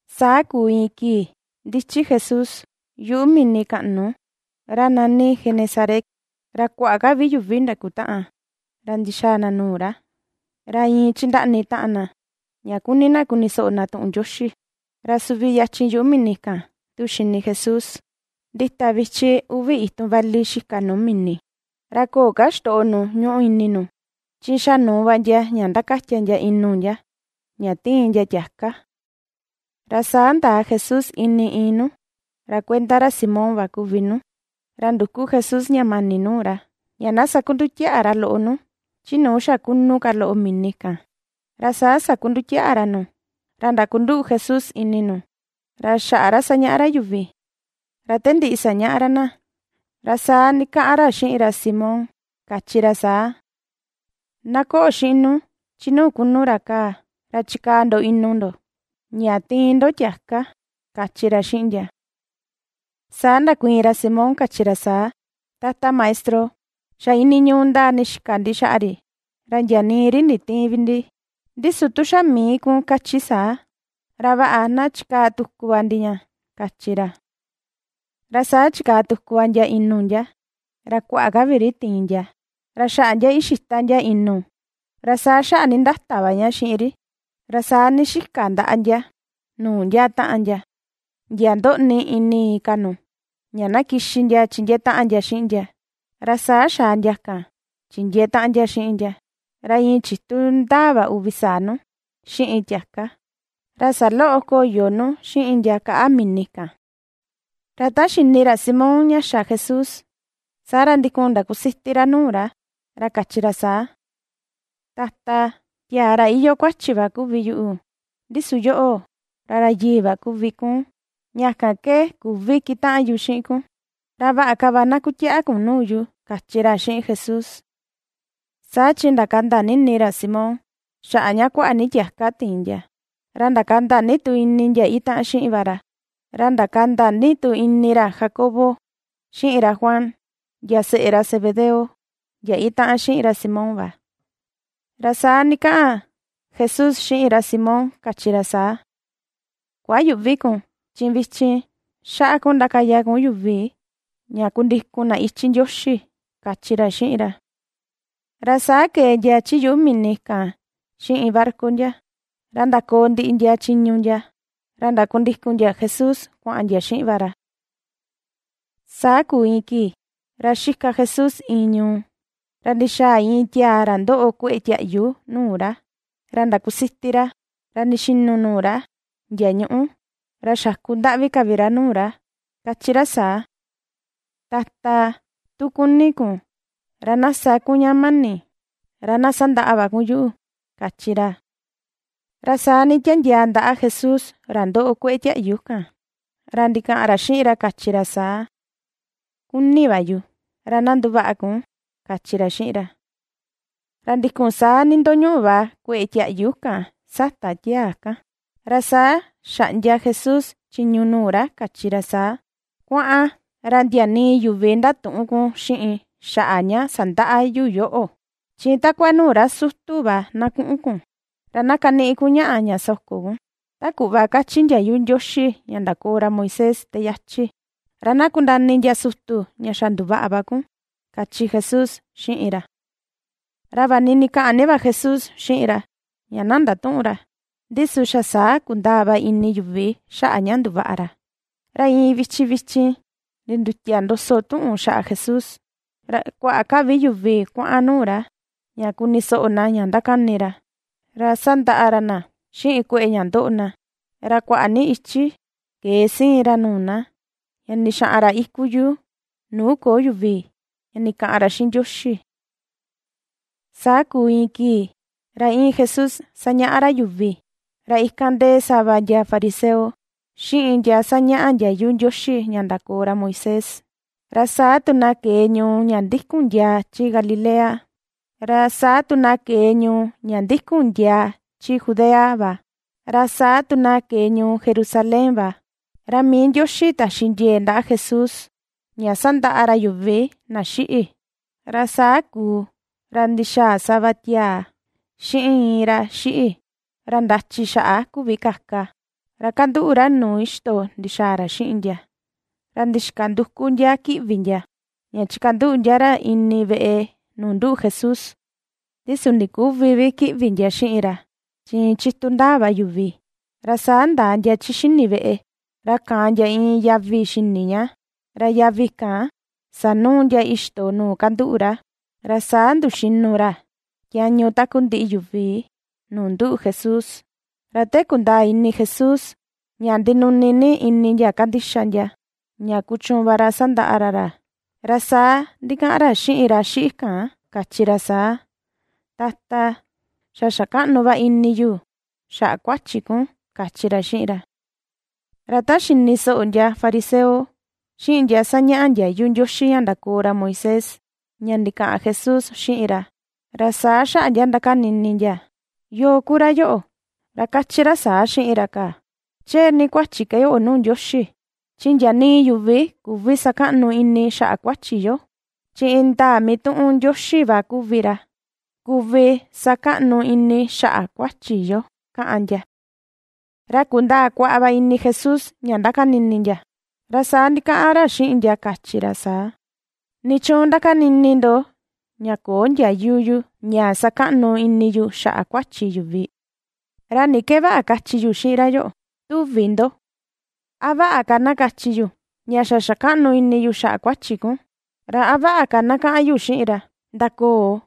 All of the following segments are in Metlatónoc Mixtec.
Saa kuu iin kii ndichi Jesús yuꞌu mini kaꞌnu ra nani Genesaret, ra kuaꞌa ka vi yuvi ndakutaꞌan, ra ndixaa na nuu ra, ra iin chindaꞌni taꞌan na ña kuni na kuni soꞌo na tuꞌun Ndioxi. Ra suvi yachin yuꞌu mini kan tu xini Jesús ndita vichi uvi itun vali xika nuu mini. Ra köo ka ixtoꞌo nu ñuꞌu ini nu, chi xa nuu va ndia ña ndakatia ndia inu ndia ña ^tiin ndia tiaka. Ra saa ndaa Jesús ini iin nu; ra kuenda ra Simón va kuvi nu. Ra nduku Jesús ña mani nuu ra, ña na sakundutiaꞌa ra loꞌo nu chi nuu xa kunu ka loꞌo mini kan. Ra saa sakundutiaꞌa ra nu, ra ndakunduꞌu Jesús ini nu ra xaꞌa ra sañaꞌa ra yuvi. Ra te ndiꞌi sañaꞌa ra na, ra saa ndikaꞌan ra xiꞌin ra Simón, kachi ra saa: ―Na koꞌo xiꞌin nu chi nuu kunu ra kaa, ra chikaa ndo inu ndo ña tiin ndo tiaka ―kachi ra xiꞌin ndia. Saa ndakuiin ra Simón, kachi ra saa: ―Tata Maestro, xa iinii ñuu ndaa ndixika ndi xaꞌa ri, ra ndia nii ri nditïin vi ndi. Ndi su tu xa mii kun kachi saa, ra vaꞌa, na chikaa tuku va ndi ña ―kachi ra. Ra saa chikaa tuku va ndia inu ndia. Ra kuaꞌa ka vi ri tiin ndia ra xaꞌa ndia ixita ndia inu, ra saa xaꞌa ndindata va ña xiꞌin ri. Ra saa ndixika ndaꞌa ndia nuu ndia taꞌan ndia, ndia ndoꞌni ini inka nu, ña na kixi ndia chindiee taꞌan ndia xiꞌin ndia. Ra saa xaa ndia kan chindiee taꞌan ndia xiꞌin ndia. Ra iin chitu ndaa va uvi saa nu xiꞌin tiaka, ra saloꞌo koyo nu xiꞌin ndia kaꞌa mini kan. Ra ta xini ra Simón ña xa Jesús, saa ra ndikun ndakusiti ra nuu ra, ra kachi ra saa: ―Tata, tiaa ra iyoo kuachi va kuvi yuꞌu, ndi su yoꞌo, ra ra yii va kuvi kun. Ña kan ke küvi kitaꞌan yu xiꞌin kun, ra vaꞌa ka na kutiaꞌa va kun nuu yu ―kachi ra xiꞌin Jesús. Saa chi ndakanda ni ini ra Simón xaꞌa ña kuaꞌa ni tiaka tiin ndia. Ra ndakanda ni tu ini ndia itaꞌan xiꞌin va ra. Ra ndakanda ni tu ini ra Jacobo, xiꞌin ra Juan ndia seꞌe ra Zebedeo, ndia itaꞌan xiꞌin ra Simón va. Ra saa ndikaꞌan Jesús xiꞌin ra Simón, kachi ra saa: ―Kuayüꞌvi kun; chi vichin nduu kun ra sañaꞌa yuvi ña ndakundikun na yuꞌu ―kachi ra xiꞌin ra. Ra saa ke̱e ndia chi yuꞌu mini kan xiꞌin barca ndia. Ra ndakoo ndiꞌi ndia chiñu ndia. Ra ndakundikun ndia Jesús, kuaꞌan ndia xiꞌin va ra. Saa kuu iin kii ra xika Jesús iin ñuu, ra ndixaa iin tiaa ra ndoꞌo kue̱ꞌe̱ tiaꞌyu nuu ra. Ra ndakusiti ra, ra ndixinu nuu ra ndia ñuꞌu, ra xakundaꞌvi ka vi ra nuu ra, kachi ra saa: ―Tata, tu kuni kun, ra na sa kun ña mani ra na sandaꞌa va kun yuꞌu ―kachi ra. Ra saa nditandiaa ndaꞌa Jesús ra ndoꞌo kueꞌe tiaꞌyu kan ra ndikaꞌan ra xiꞌin ra, kachi ra saa: ―Kuni va yu; ra na nduvaꞌa kun ―kachi ra xiꞌin ra. Ra ndikun saa ndindoñuꞌu va kue̱ꞌe̱ tiaꞌyu kan sata tiaa kan. Ra saa xaꞌndia Jesús chiñu nuu ra kachi ra saa: ―Kuaꞌan, ra ndia nii yuvi ndatüꞌun kun xiꞌin xaꞌa ña sandaꞌa yu yoꞌo. Chi takua nuu ra sutu va na kuꞌun kun, ra na kaniꞌi kun ñaꞌa ña soko kun ta kuꞌva kachi ndiayu Ndioxi ña ndakoo ra Moisés ta yachi; ra na kundaa ini ndia sutu ña xa nduvaꞌa va kun ―kachi Jesús xiꞌin ra. Ra vaꞌa ni ndikaꞌan ni va Jesús xiꞌin ra ña na ndatüꞌun ra, ndi su xa saa kundaa va ini yuvi xaꞌa ña nduvaꞌa ra. Ra iin vichin vichin ndindutia ndoso tuꞌun xaꞌa Jesús, ra kuaꞌa ka vi yuvi kuaꞌan nuu ra ña kuni soꞌo na ña ndakani ra, ra sandaꞌa ra na xiꞌin kueꞌe ña ndoꞌo na. Ra kuaꞌa ni ichi ke̱e siin ra nuu na, ña ndixaꞌan ra iku yuu nuu köo yuvi ña ndikaꞌan ra xiꞌin Ndioxi. Saa kuu iin kii ra íin Jesús sañaꞌa ra yuvi. Ra ikan ndee sava ndia fariseo, xiꞌin ndia sañaꞌa ndiayu Ndioxi ña ndakoo ra Moisés. Ra saa tu na ke̱e ñuu ña ndikun ndiaa chi Galilea, ra saa tu na ke̱e ñuu ña ndikun ndiaa chi Judea va. Ra saa tu na ke̱e ñuu Jerusalén va. Ra mii Ndioxi taxi ndie̱e̱ ndaꞌa Jesús ña ^sandaꞌa ra yuvi na xiꞌi. Ra saa kuu, ra ndixaa sava tiaa xiꞌin iin ra xiꞌi ra ndachi xaꞌa küvi kaka, ra kanduꞌu ra nuu ixto ndixaa ra xiꞌin ndia. Ra ndixika nduku ndia kiꞌvi ndia ña chikanduꞌu ndia ra ini veꞌe nuu nduꞌu Jesús. Ndi su ndiküvi vi kiꞌvi ndia xiꞌin ra, chi iin chitu ndaa va yuvi. Ra saa ndaa ndia chi xini veꞌe, ra kaan ndia iin yavi xini ña. Ra yavi kan sanuu ndia ixto nuu kanduꞌu ra. Ra saa nduxinu ra tiañu takundiꞌi yuvi, nuu nduꞌu Jesús. Ra te kundaa ini Jesús ña ndinuni ni ini ndia ^kandixa ndia, ña kuchuun va ra sandaꞌa ra ra. Ra saa ndikaꞌan ra xiꞌin ra xiꞌi kan, kachi ra saa: ―Tata, xa xa kaꞌnu va ini yu xaꞌa kuachi kun ―kachi ra xiꞌin ra. Ra ta xini soꞌo ndia fariseo, xiꞌin ndia sañaꞌa ndiayu Ndioxi ña ndakoo ra Moisés, ña ndikaꞌan Jesús xiꞌin ra, ra saa xaꞌa ndia ndakani ini ndia: “¿Yoo ku ra yoꞌo, ra kachi ra saa xiꞌin ra kaa? Chee ni kuachi ke yoꞌo nuu Ndioxi, chi ndia nii yuvi, ra küvi sakaꞌnu ini na xaꞌa kuachi yo, chi indaa mituꞌun Ndioxi va ku ra kuvi sakaꞌnu ini xaꞌa kuachi yo”, kaꞌan ndia. Ra kundaa kuaꞌa va ini Jesús ña ^ndakani ini ndia, ra saa ndikaꞌan ra xiꞌin ndia, kachi ra saa: ―¿Nichuun ndakani ini ndo ña köo ndiayu yu ña sakaꞌnu ini yu xaꞌa kuachi yuvi? ¿Ra ni ke vaꞌa kachi yu xiꞌin ra yoꞌo, tuvi ndo? ¿A vaꞌa ka na kachi yu ña: “Xa xakaꞌnu ini yu xaꞌa kuachi kun”? ¿Ra a vaꞌa ka na kaꞌan yu xiꞌin ra: “Ndakoo,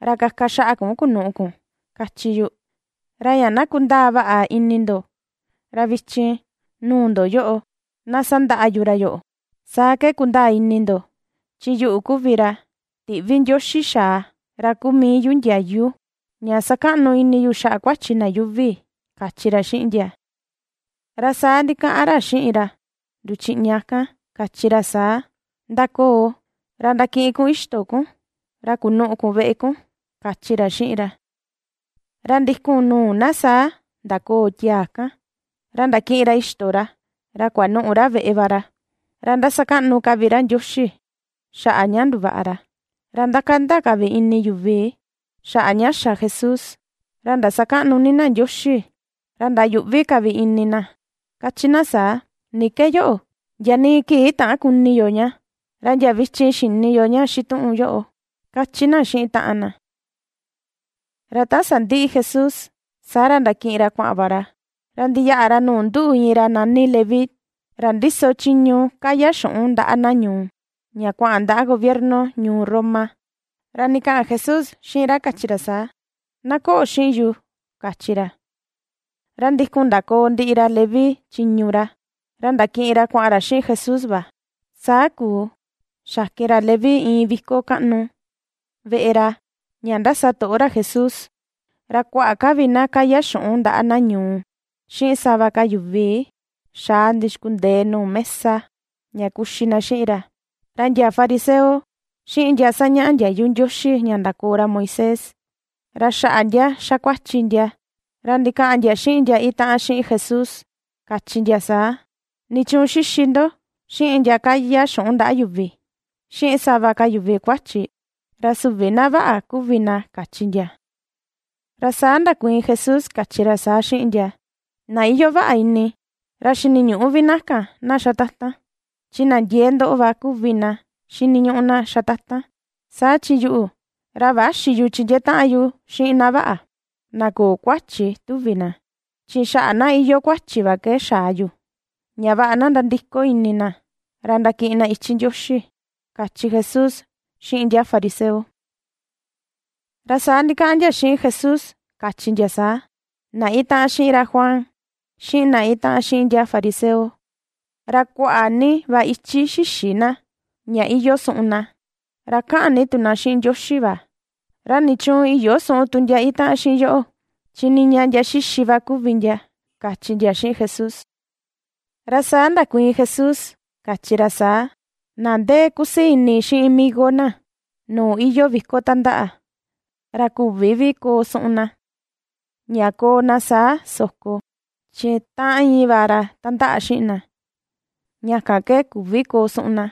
ra kaka xaꞌa kun kunuꞌu kun”?, kachi yu. Ra ña na kundaa vaꞌa ini ndo, ra vichin nuu ndo yoꞌo, na sandaꞌa yu ra yoꞌo, saa ke kundaa ini ndo chi yuꞌu kuvi ra tiꞌvi Ndioxi xaa, ra kuu mii yu ndiayu ña sakaꞌnu ini yu xaꞌa kuachi na yuuvi ―kachi ra xiꞌin ndia. Ra saa ndikaꞌan ra xiꞌin ra nduchiꞌña kan, kachi ra saa: ―Ndakoò, ra ndakiꞌin kun ixto kun, ra kunuꞌu kun veꞌe kun ―kachi ra xiꞌin ra. Ra ndikun nuu na saa ndakoò tiaa kan, ra ndakiꞌin ra ixto ra, ra kuanuꞌu ra veꞌe va ra. Ra ^ndasakaꞌnu ka vi ra Ndioxi xaꞌa ña nduvaꞌa ra. Ra ndakanda ka vi ini yuvi xaꞌa ña xa Jesús. Ra ndasakaꞌnu ni na Ndioxi. Ra ndayuꞌvi ka vi ini na, kachi na saa: ―¿Ni ke yoꞌo? Ndia nii kii täan kuni yo ña, ra ndia vichin xini yo ña xituꞌun yoꞌo ―kachi na xiꞌin taꞌan na. Ra ta sandiꞌi Jesús, saa ra ndakiꞌin ra kuaꞌan va ra, ra ndiyaꞌa ra nuu nduꞌu iin ra nani Leví ra ndiso chiñu kaya xuꞌun ndaꞌa na ñuu, ña kuaꞌan ndaꞌa gobierno ñuu Roma. Ra ndikaꞌan Jesús xiꞌin ra kachi ra saa: ―Na koꞌo xiꞌin yu ―kachi ra. Saa ra, ndikun ndakoo ndiꞌi ra Leví chiñu ra, ra ndakiꞌin ra kuaꞌan ra xiꞌin Jesús va. Saa kuu, xakin ra Leví iin viko kaꞌnu veꞌe ra ña ndasatoꞌo ra Jesús. Ra kuaꞌa ka vi na kaya xuꞌun ndaꞌa na ñuu, xiꞌin sava ka yuvi xaa ndixkundee nuu mesa ña kuxi na xiꞌin ra. Ra ndia fariseo, xiꞌin ndia sañaꞌa ndiayu Ndioxi ña ndakoo ra Moisés, ra xaꞌa ndia xa kuachi ndia ra ndikaꞌan ndia xiꞌin ndia itaꞌan xiꞌin Jesús, kachi ndia saa: ―¿Nichuun xixi ndo xiꞌin ndia kaya xuꞌun ndaꞌa yuvi, xiꞌin sava ka yuvi kuachi? Ra süvi na vaꞌa kuvi na ―kachi ndia. Ra saa ndakuiin Jesús, kachi ra saa xiꞌin ndia: ―Na iyoo vaꞌa ini, ra xiniñüꞌu vi na kan na xatatan, chi na ndiee ndoꞌo va ku na xiniñuꞌu na xatatan. Saa chi yuꞌu, ra växi yu chindiee taꞌan yu xiꞌin na vaꞌa, na köo kuachi, tuvi na. Chi xaꞌa na iyoo kuachi va ke xaa yu, ña vaꞌa na ndandiko ini na ra ndakiꞌin na ichi Ndioxi ―kachi Jesús xiꞌin ndia fariseo. Ra saa ndikaꞌan ndia xiꞌin Jesús, kachi ndia saa: ―Na itaꞌan xiꞌin ra Juan, xiꞌin na itaꞌan xiꞌin ndia fariseo, ra kuaꞌa ni va ichi xïxi na, ña iyoo suꞌun na, ra kaꞌan ni tu na xiꞌin Ndioxi va. ¿Ra nichuun iyöo suꞌun tu ndia itaꞌan xiꞌin yoꞌo? Chi niña ndia xixi va kuvi ndia ―kachi ndia xiꞌin Jesús. Ra saa ndakuiin Jesús, kachi ra saa: ―Na ndee kusii ini xiꞌin migo na nuu iyoo viko tandaꞌa, ra küvi vi koo suꞌun na, ña koo na saa soko, chi ta íin va ra tandaꞌa xiꞌin na, ña kan ke küvi koo suꞌun na.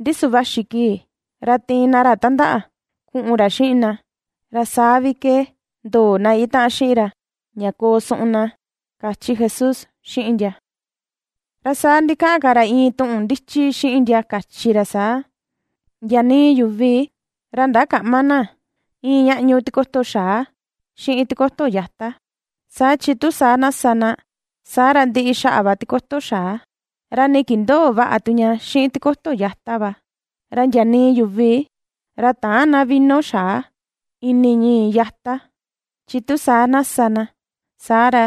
Ndi su vaxi kii, ra tiin ndia ra tandaꞌa kuꞌun ra xiꞌin ndia, ra saa vi ke ndoo na itaꞌan xiꞌin ra ña koo suꞌun na ―kachi Jesús xiꞌin ndia. Ra saa ndikaꞌan ka ra iin tuꞌun ndichi xiꞌin ndia, kachi ra saa: ―Ndia nii yuvi ra ndakäꞌma na iin ñaꞌñu tikoto xaa xiꞌin tikoto yata. Saa chi tu saa na sa na, saa ra ndiꞌi xaꞌa va tikoto xaa. Ra nii kindöo vaꞌa tu ña xiꞌin tikoto yata va. Ra ndia nii yuvi ra täan na vino xaa ini ñii̱ yata, chi tu saa na sa na, saa ra,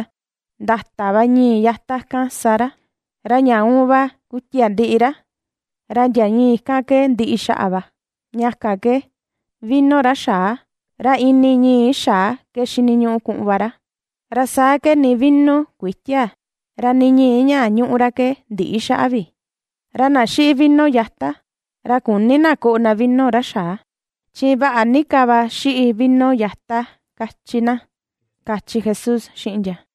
ndata va ñii̱ yata kan sa ra, ra ña uun va kuitia ndiꞌi ra, ra ndia ñii̱ kan ke ndiꞌi xaꞌa va. Ña kan ke vino ra xaa, ra ini ñii̱ xaa ke xiniñuꞌu kuꞌun va ra, ra saa ke nii vino kütia, ra nii ñii̱ ña ñuꞌu ra ke ndïꞌi xaꞌa vi. Ra na xiꞌi vino yata, ra küni na koꞌo na vino ra xaa, chi vaꞌa ni ka va xiꞌi vino yata kachi na ―kachi Jesús xiꞌin ndia.